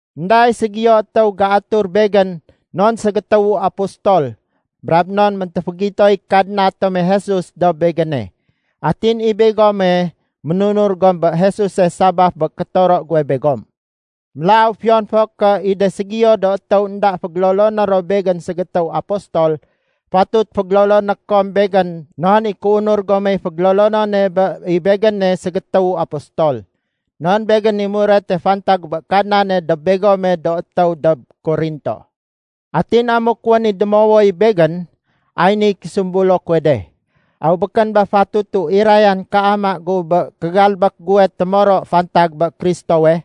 Enda i ségiyo étéw géatur begén non ségétéwu apostol brab non méntéfégitoy Kadna tome Jesus dob begéne. Atin i begome, ménunur gom bé Jesuse sabaf bé kétoro guwe begom. Mélaw fiyon fo ké i de ségiyo do étéw énda fégéloloné ro begén ségétéw apostol, fatut fégéloloné kom begén non i kéunur gomey fégélolonone bé i begéne ségétéwu apostol. Non begén i murete fantag bé Kadnane dob begome do étéw dob Korinto. Atin amuk wén i démowoy begén, ay niy késumbulo kuwe de: Aw békén ba fatutu irayan kéama gu bé kégalbék guwe témoro fantag bé Kristowe?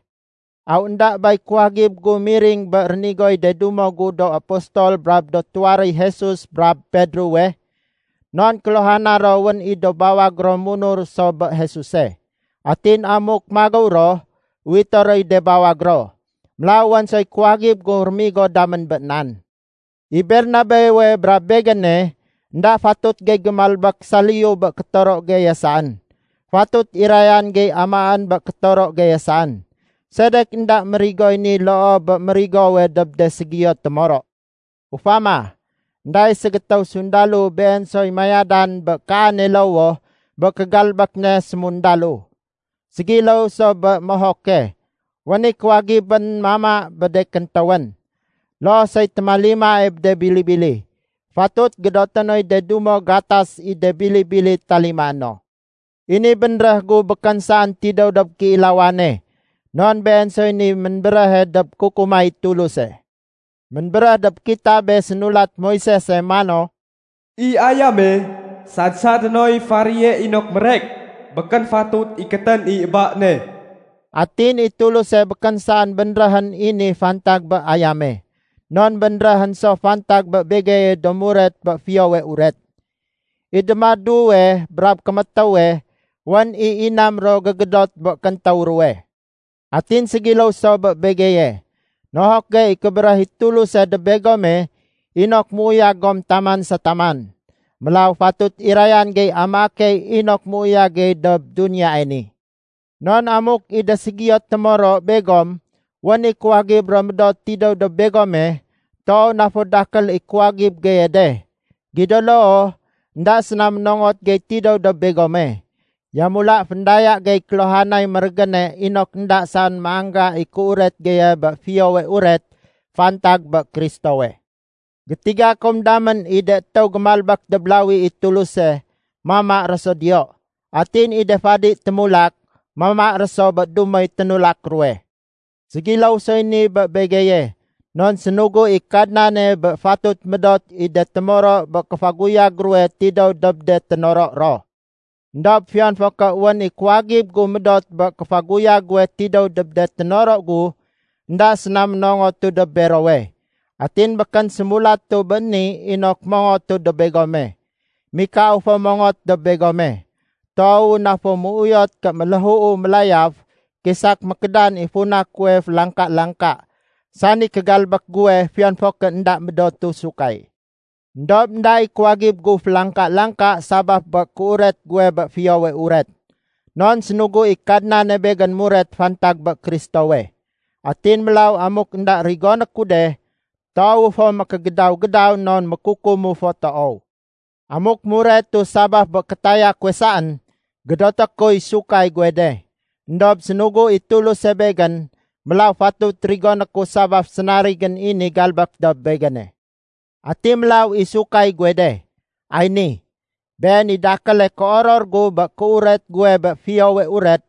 Aw énda bay kuwagib gu miring bé rénigoy de dumo gu do apostol brab de tuwaréy Jesus brab Pedrowe? Non kéluhana ro wén i do bawag ro munur so bé Jesuse. Atin amuk magéw ro, uwité roy de bawag ro. Mélaw wén soy kuwagib gu rémigo damén bé nan. I Bernabewe brab begéne, énda fatut gey gémalbék saliyu bé kétoro geye saén. Fatut irayan gey amaén bé kétoro geye saén. Sedek énda mérigoy ni loo bé mérigowe dob de ségiyo témoro? Ufama, énda i ségétéw sundalo been soy mayadan bé kaane lowoh bé kégalbék ne sémundalo. Ségiléw so bé mohoke, wén i kuwagibén mama bé de kéntéwén. Loo soy témalimae bé de bili-bili, fatut gédoté noy de dumo gatas i de bili-bili talimaé no. I ni bénréh gu békén saén tidéw dob kéilawane, non been soy niy ménbéréhe dob kukumay Tuluse. Ménbéréh dob kitabe sénulat Moisese mano, “I ayame sad-sadé noy faréye inok mérek, békén fatut ikétén i ba ne.” Atin i Tuluse békén saén bénréhén i ni fantag bé ayame. Non bénréhén so fantag bé begeye do muret bé Fiyowe Uret. I démaduwe brab kémétéwe wén i inam ro gégédot bé kéntéw ruwe. Atin ségiléw so bé begeye. Nohok gey i kébéréh i Tuluse dob begome inok méuyag gom taman sa taman. Mélaw fatut irayan gey amaé key inok méuyag gey dob duniyae ni. Non amuk i de ségiyo témoro begom wén i kuwagib ro médot tidéw dob begome, toow na fo dakél i kuwagib geye de. Gido loo, énda séna ménongot gey tidéw dob begome. Yamula féndaya gey kéluhanay mérégéne inok énda saén méangga i kéuret geye bé Fiyowe Uret fantag bé Kristowe. Gétiga kom damén i de étéw gémalbék dob lawi i Tuluse, mama ro so diyo. Atin i de fadi témulak, mama ro so bé dumoy ténulak ruwe. Ségiléw soy ni bé begeye. Non sénugu i Kadnane bé fatut médot i de témoro bé kéfaguyag ruwe tidéw dob de ténoro ro. Endob fiyon fo ké wén i kuwagib gu médot bé kéfaguyag guwe tidéw dob de ténoro gu, énda séna ménongotu dob berowe. Atin békén sémulatu béni inok mongotu dob begome. Mikau fo mongot dob begome. Toowu na fo méuyot ké méléhuu mélayaf kisak mékédan i funa kuwe félangka-langka, sani kégalbék guwe fiyon fo ké énda médotu sahud. Endob énda i kuwagib gu félangka-langka sabaf bé kéuret guwe bé Fiyowe Uret. Non sénugu i Kadnane begén muret fantag bé Kristowe. Atin mélaw amuk énda rigoné ku de, toowu fo mékégédaw-gédaw non mékukumu fo toow. Amuk muretu sabaf bé kétaya kuwe saén, gédoté kuy sahud guwe de. Endob sénugu i Tuluse bégén, mélaw fatut rigoné ku sabaf sénarigén i ni galbék dob begéne. Ati mélaw i sahud guwe de? Ay ni: Been i dakéle kéoror gu bé kéuret guwe bé Fiyowe Uret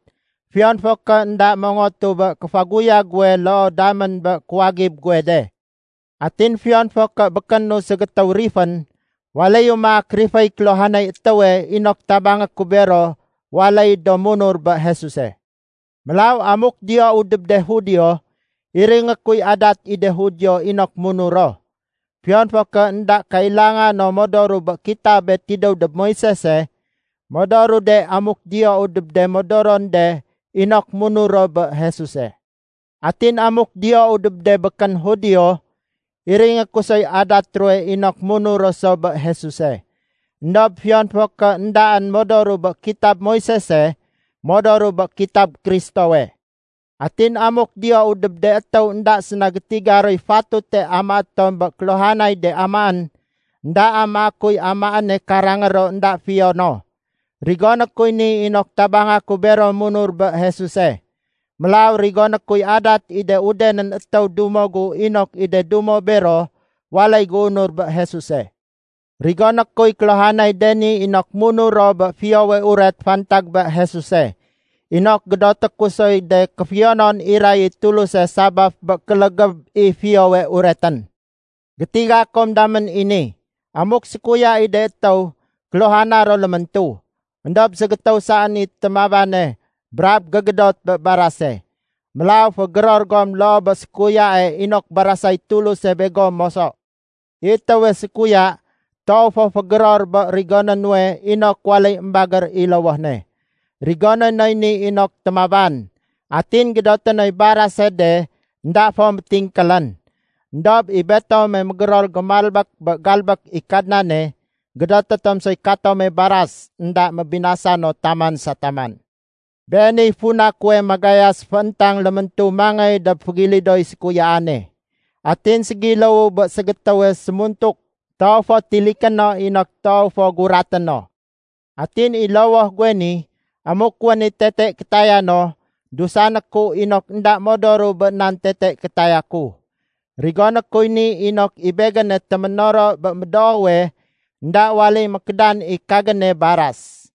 fiyon fo ké énda mongotu bé kéfaguyag guwe loo damén bé kuwagib guwe de. Atin fiyon fo ké békénu ségétéw rifén, waléyu maak riféy kéluhanay étéwe inok tabangé ku bero waléy do munur bé Jesuse. Mélaw amuk diyou dob de Judio, iringé kuy adat i de Judio inok munur ro. Fiyon fo ké énda kailanga no modoru bé kitabe tidéw dob Moisese, modoru de amuk diyou dob de modoron de inok munur ro bé Jesuse. Atin amuk diyou dob de békén Judio, iringé ku soy adat ruwe inok munur ro so bé Jesuse. Endob fiyon fo ké éndaén modoru bé kitab Moisese, modoru bé kitab Kristowe. Atin amuk diyou dob de étéw énda séna gétiga roy fatute amaé tom bé kéluhanay de amaén, énda amaé kuy amaéne karangé ro énda fiyo no. Rigoné kuy ni inok tabanga ku bero munur bé Jesuse. Mélaw rigoné kuy adat i de udenén étéw dumo gu inok i de dumo bero waléy géunur bé Jesuse. Rigoné kuy kéluhanay de ni inok munur ro bé Fiyowe Uret fantag bé Jesuse, inok gédoté ku soy de kéfiyonon iray i Tuluse sabaf bé kélégéb i Fiyowe Uretén. Gétiga kom damén i ni. Amuk sékuya i de étéw, kéluhana ro léméntu, éndob ségétéw saén i témabane brab gégédote bé barase. Mélaw fégéror gom loo bé sékuyae inok barasay Tuluse begom moso. I étéwe sékuya toow fo fégéror bé rigoné nuwe inok waléy émbagér i lowoh ne. Rigoné noy ni inok témaban, atin gédoté noy barase de énda fo métingkélén. Endob i betome mégéror gémalbék bé galbék i Kadnane, gédoté tom soy katome baras énda mébinasa no taman sa taman. Beeniy funa kuwe magayas féntang léméntu mangéy dob fégilidoy sékuyaane. Atin ségiléwu bé ségétéwe sémuntuk, toow fo tiliké no inok toow fo guraté no. Atin i lowoh guwe ni, amuk wén i tete kétaya no, dusané ku inok énda modoru bé nan tete kétaya ku. Rigoné kuy ni inok i begéne téménoro bé médoowe, énda waléy mékédan i kagéne baras.